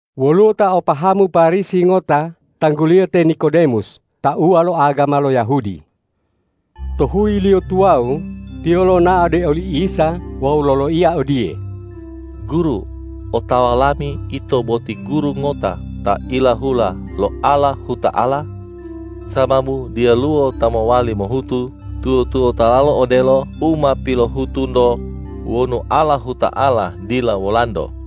Woluwo ta o pahamu Parisi ngota tangguliyo te Nikodemus tauwa lo agama lo Yahudi. To huyiliyo tuwawu tiyo lonao ode oli Isa wawu loloiya odiye,”Guru, otawa lami Ito boti guru ngota ta ilahula lo Allahuta'ala, sababu diyaluwo ta mowali mohutu tuwo-tuwotalo odelo u ma pilohutu-Nto wonu Allahuta'ala dila Wolanto.”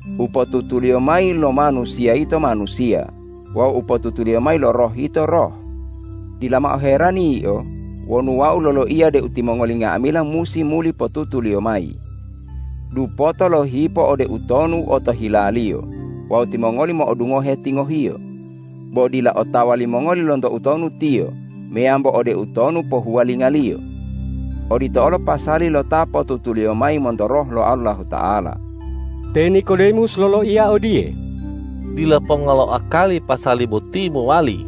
U potutuliyo mayi lo manusiya yito manusiya wawu u pilotutuliyo mayi lo Roh yito Roh. Dila mao herani yio wonu Wau loloiya deu timongoli nga'amila musi muli potutuliyo mayi. Dupoto lohipo ode utonu otohilaliyo wawu timongoli mo'odungohe tingohiyo, bo dila otawa limongoli lonto utonu tiyo meyambo ode utonu pohuwalingaliyo. Odito olo pasali lo ta potutuliyo mayi monto Roh lo Allahuta'ala.” Te Nikodemus loloiya odiye,”Dila ponga lo akali pasali boti mowali.”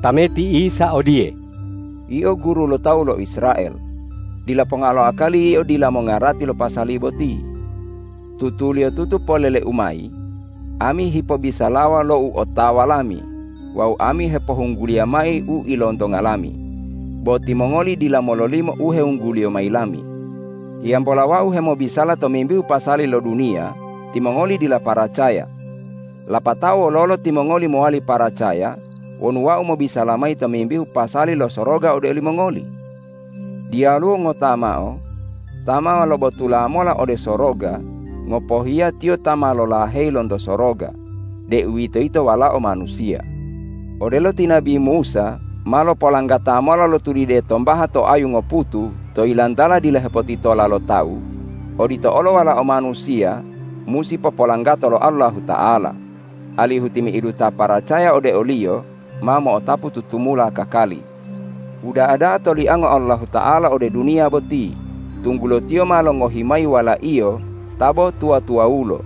Tameti Isa odiye,”Yio guru lo tawu lo Israel; dila ponga lo akali yio dila mongarati lo pasali boti. Tutuliyotutu polele-U mayi: Ami hipobisalawa lo u otawa Lami wawu Ami hepohungguliya mayi u ilontonga Lami, bo timongoli dila mololimo u hewungguliyo mayi Lami. Hiyambola Wau hemobisala tomimbihu pasali lo duniya timongoli dila paracaya. Lapatao wololo timongoli mowali paracaya wonu Wau mobisala mayi tomimbihu pasali lo soroga ode olimongoli? Diyaluwo ngota mao ta ma lobotula mola ode soroga, ngopohiya Tiyo ta ma lolaheyi lonto soroga, deuwitoyito Walao Manusiya. Odelo ti nabi Musa ma lopolanggata mola lo tulide tombaha to ayu ngoputu to yilantala dila hepotitola lo tawu, odito olo Walao Manusiya musi popolanggato lo Allahuta'ala, alihu timi'idu ta paracaya ode o-Liyo ma mo'otapu tutumula kakali.” Uda'a da'a toliango Allahuta'ala ode duniya boti, tunggulo Tiyo ma longohi mayi Wala-Iyo ta bo tuwa-tuwawulo,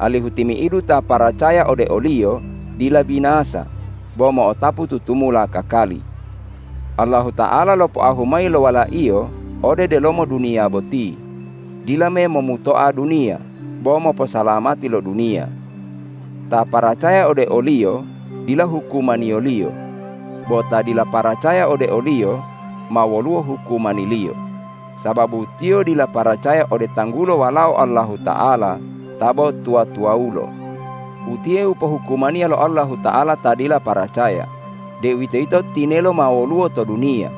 alihu timi'idu ta paracaya ode o-Liyo dila binasa, bo mo'otapu tutumula kakali. Allahuta'ala lopoahu mayi lo Wala-Iyo ode delomo duniya boti dila memomutoa duniya, bo moposalamati lo duniya. Ta paracaya ode o-Liyo dila hukumaniyo-Liyo; bo ta dila paracaya ode o-Liyo ma woluwo hukumaniliyo, sababu tiyo dila paracaya ode tanggulo Walao Allahuta'ala ta bo tuwa-tuwawulo. Utiye u pohukumaniya lo Allahuta'ala ta dila paracaya deuwitoyito, tinelo ma woluwo to duniya,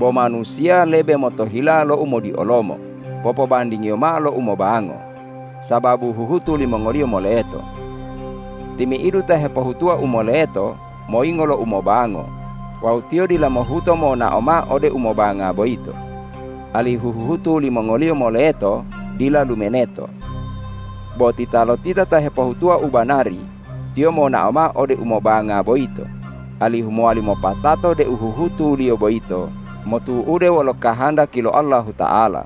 bo manusiya lebe motohila lo umodiolomo popobandingiyo mao lo umobango, sababu huhutu limongoliyo moleto. Timi'idu ta hepohutuwa u moleto moyingo lo umobango wawu tiyo dila mohuto monao mao ode umobanga boyito, alihu huhutu limongoliyo moleto dila lumuneto. Bo titalotita ta hepohutuwa u banari, tiyo monao mao ode umobanga boyito, alihu mowali mopatato deu huhutuliyo boyito motu'ude wolo kahandaki lo Allahuta'ala.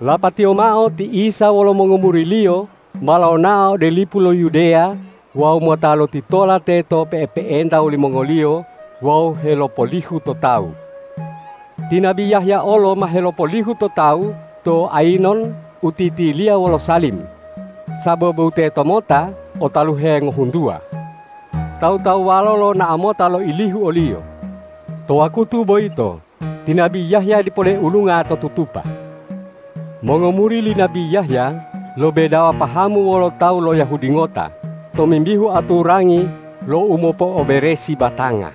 Lapatiyo mao ti Isa wolo mongomuri-Liyo ma lonao ode lipu lo Yudeya wawu mota lotitola teto pe'epe'enta wolimongoliyo wawu helopolihu to tawu. Ti nabi Yahya olo ma helopolihu to tawu to Ayinon u titiliya wolo Salim, sababu tetomota o taluhe ngohuntuwa. Tawu-tawuwalo lonao mota loilihu oliyo. To wakutu boyito ti nabi Yahya dipo leulunga to tutupa. Mongomuri li nabi Yahya lo bedawa pahamu wolo tawu lo Yahudi ngota tomimbihu aturangi lo umopo'oberesi batanga.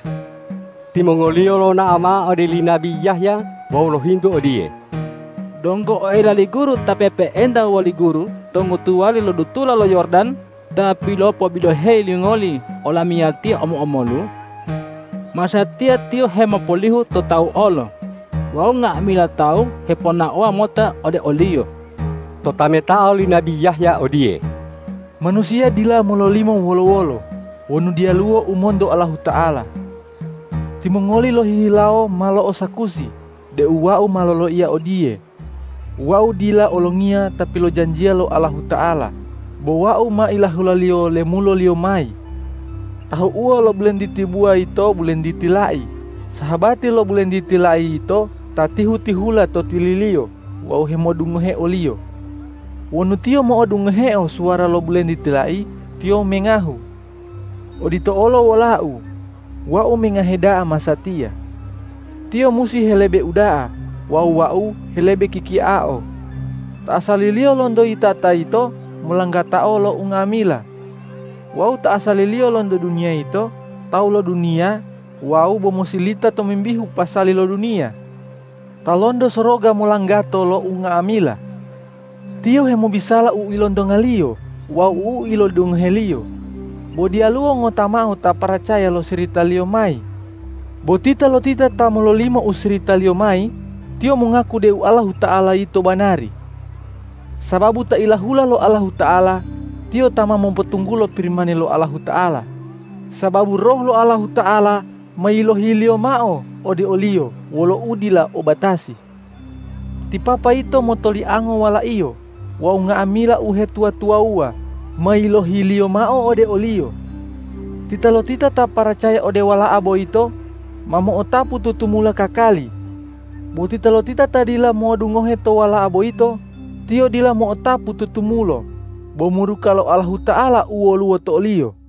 Timongoliyo lonao mao ode li nabi Yahya wawu lohintu odiye,”Donggo oela li guru Ta pe'epe'enta woli guru to ngotuwali lo dutula lo Yordan, Ta pilopobiloheyi lingoli olamiyatiya omo-omolu? Masatiya Tiyo hemopolihu to tawu olo wawu nga'amila tawu heponaowa mota ode o-Liyo!” Totametao li nabi Yahya odiye,”Manusiya dila mololimo wolo-wolo wonu diyaluwo u monto Allahuta'ala. Timongoli lohihilawo ma lo'osakusi deu wau ma loloiya odiye, ’Wau dila Olongiya ta pilojanjiya lo Allahuta'ala, bo wau ma ilahula-Liyo lemulo-Liyo mayi.’ Tahu'uwo lo bulentiti buwa yito bulentiti lai sahabati lo bulentiti lai yito ta tihu-tihula to tililiyo wawu hemodungohe oliyo. Wonu tiyo mo'odungoheo suwara lo bulentiti lai, tiyo mengahu. Odito olo wolau, wau mengahe da'a masatiya. Tiyo musi helebe uda'a wawu wau helebe kikiao.” Ta asaliliyo lonto yitata yito molanggatao lo unga'amila; wawu ta asaliliyo lonto duniya yito tawu lo duniya wawu bo mosilita tomimbihu pasali lo duniya. Ta lonto soroga molanggato lo unga'amila. Tiyo hemobisala u ilontonga-Liyo wawu u ilodungohe-Liyo, bo diyalu ngota mao ta paracaya lo sirita-Liyo mayi. Bo titalotita ta mololimo u sirita-Liyo mayi, tiyo mongaku deu Allahuta'ala yito banari. Sababu Ta ilahula lo Allahuta'ala, Tiyo ta ma mopotunggulo Pirimani lo Allahuta'ala, sababu Roh lo Allahuta'ala ma yilohi-Liyo mao ode o-Liyo wolo udila o batasi. Ti Papa yito motoliango Wala-Iyo wawu nga'amila uhetuwa-tuwawuwa ma yilohi-Liyo mao ode o-Liyo. Titalotita ta paracaya ode Wala'a boyito, ma mo'otapu tutumula kakali; bo titalotita ta dila modungohe to Wala'a boyito, tiyo dila mo'otapu tutumulo bo muruka lo Allahuta'ala u woluwo to oliyo.